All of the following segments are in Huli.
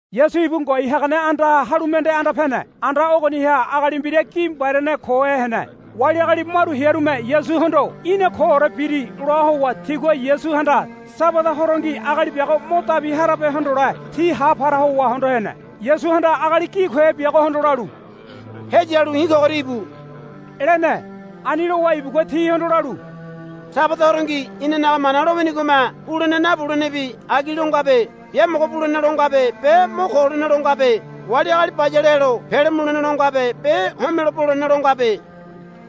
Yasu ibu ngoai hagane andaha halu mende anda pene. Anda ogoniha agali mbira gi mbariane kohe hene. Wali agali maru hearume Yasuhondo, Í̠na koore biri, loa howa tigua Yasuhanda Sabada horongi agali biago mo dabi harabe hondole ti ha para howa hondo hene. Yasuhanda agali gi kohe biagohondo lalu, Heyalu i̱ kogoria íbu, lene. Ani lowa ibugua tihondo lalu, Sabada horongi inanaga Mana lowinigome bulene nabulenebi agi lo ngabe. Biamogo bulene lo ngabe be mo ko holene lo ngabe. Wali agali bayale helo pele mulene lo ngabe be homelo bolene lo ngabe,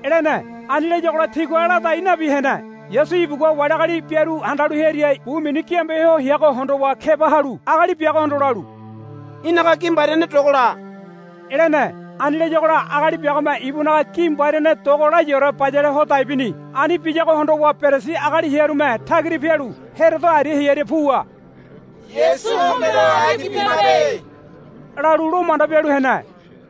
lene. Ani layagola tigua ladai nabi hene. Yasu ibugua wali agali biaru handalu hearia bu mini giambe ho heago hondowa keba halu agali biagohondo lalu, Í̠naga gi mbariane dogola, lene. Ani layagola agali biagome ibunaga gi mbariane dogo layaore bayale ho dai bini. Ani biyago hondowa Perisi agali hearume tagira pialu Herodo aria hearia puwa, Yasu homelo agi bimabe, lalu lo manda bialu hene.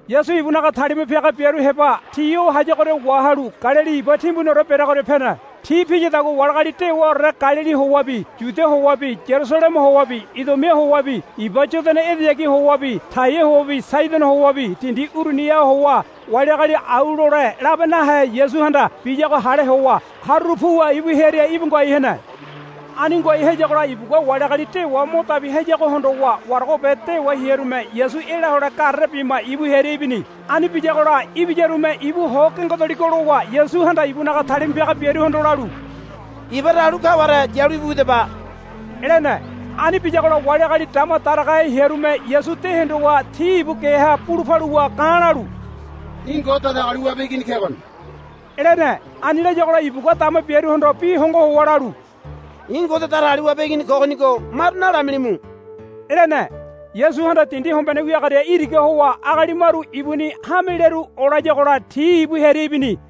Yasu ibunaga talima piaga biaru heba ti o hayagoria wahalu Galili iba timbuniore bereagoria pene. Ti piyadagua wali agali dewaore Galili howabi Yudia howabi Yarusaleme howabi Idumia howabi iba Yodana edeyagi howabi Taia howabi Saidono howabi dindi uruniha howa wali agali au lole labe nahe Yasuhanda biyago hale howa haruru puwa ibu hearia íbu ngoai hene. Ani ngoai hayagola ibugua wali agali dewa mo dabi hayago hondowa waragobe dewa hearume Yasu ela hole garere bima ibu hearia ibini. Ani biyagola ibiyarume ibu ho gengedoligo lowa Yasuhanda ibunaga talima piaga biaruhondo lalu, Iba talu kaware yalu íbu widaba, lene. Ani biyagola wali agali dama daragahe hearume Yasu de hondowa ti ibu geha bulu paluwa ga̱ lalu, Í̠ Ngode Datagaliwabe Igini kegoni, lene. Ani layagola ibugua dama biaruhondo bi hongo howa lalu, I̱ Ngode Datagaliwabe Igini kogonigo maru nalamilimu, lene. Yasuhanda dindi hombene wiagoria iraga howa agali maru ibuni hamelearu olayagola ti ibu hearia ibini.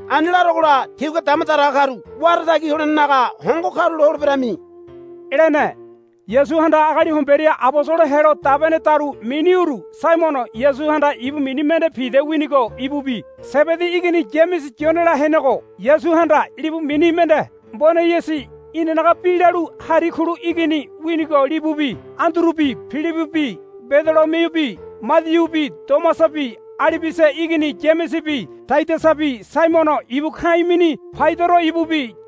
Ani larogola tígua dama daraga karu wara tagi holenenaga hongo karulo holeberami, lene. Yasuhanda agali homberia abosolo helo dabenedaru mini uru Saimono Yasuhanda ibu mini mende Pida winigo ibubi Sebedi igini Yamese Yonela henego Yasuhanda libu mini mende Boaneyisi inanaga bi lalu Hari Kulu igini winigo libubi Andurubi Pilibibi Badolomiubi Madiubi Tomasabi Alibiasa igini Yamesebi Tadiasabi Saimono ibu ka̱i̱ mini Paidoro ibubi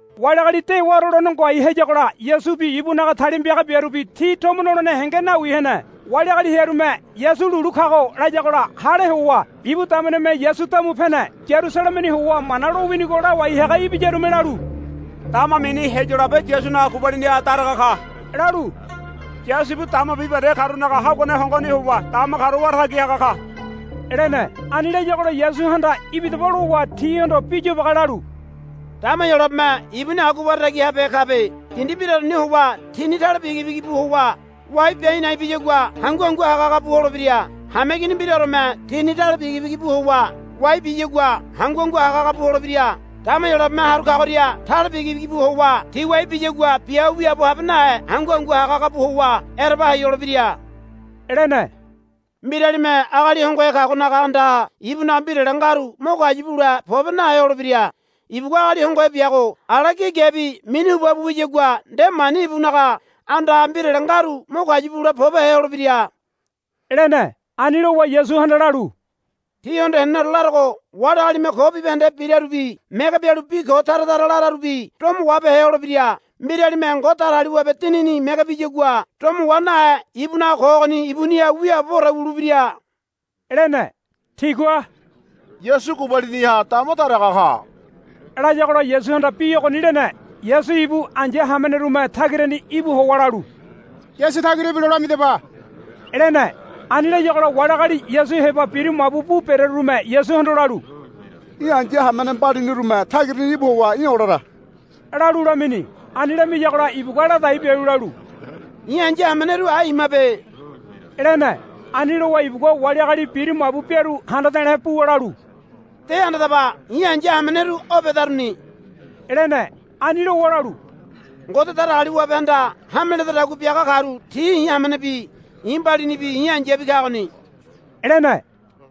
Wali agali dewaore lone ngoai hayagola Yasubi ibunaga talima piaga biarubi ti tomo nolene henge nawi hene. Wali agali hearume, Yasu lulu kago, layagola hale howa ibu dameneme Yasu damu pene. Yarusalemeni howa Mana lowinigo lawai haga ibiyarume lalu, Dama mini Heyolabe Yasunaga gubaliniha daraga ka, lalu, Yasu ibu dama bibahende karunaga haguane hongoni howa dama karu wara tagi haga ka, lene. Ani layagola Yasuhanda, Ibidaba, lowa tihondo bi yobage lalu, Dama Heyolabeme ibuni agua wara tagi habehe kabe. Dindi mbiraoreni howa tini tale bigibigi bu howa wai bia a̱i̱ na̱i̱ biyagua hangu hangu haga haga bu holebira. Hameigini mbiraoreme tini tale bigibigi bu howa wai biyagua hangu hangu haga haga bu holebira. Dama Heyolabeme haru kagoria tale bigibigi bu howa ti wai biyagua bia ho wiaabo habe nahe hangu hangu haga haga bu howa ereba hai holebira, lene. Mbiralime agali hongohe kagonaga andaha ibunaga mbirale ngaru mo kayu bule pobe nahe holebira. Ibugua agali hongohe biago ala gi gebi minu huba bu wiyagua nde mani ibunaga andaha mbirale ngaru mo kayu bule pobehe holebira, lene. Ani lowa Yasuhanda lalu, Tíhondo heneneore larogo. Wali agalime ko bibahende birarubi mege bialu bi ko tara tara lararubi domo wahabehe holebira. Mbiralime Ngode Datagaliwabe Dinini mege biyagua domo wa nahe ibunaga ko ogoni ibuniha wiaaboboore wulebira, lene. Tigua, Yasu gubaliniha dama daraga ka, layagola Yasuhanda bi ogoni lene. Yasu ibu ai̱ya hamenerume tagirani íbu howa lalu, Yasu tagira ibilo lamidaba, lene. Ani layagola wali agali Yasu heba biru mabu bu berearume Yasuhondo lalu, Í̠ ai̱ya hamene mbalinirume tagirani íbu howa í̠ olara, lalu lamini. Ani lamiyagola ibugua ladai bialu lalu, I̱ ai̱ya hameneru ai imabe, lene. Ani lowa ibugua wali agali biru mabu biaru handa de̱le̱ buwa lalu, De handadaba. I̱ ai̱ya hameneru o bedaruni, lene. Ani lowa lalu, Ngode Datagaliwabehanda hame ledadagua biaga karu ti i̱ hamenebi i̱ mbalinibi i̱ ai̱yabi kagoni, lene.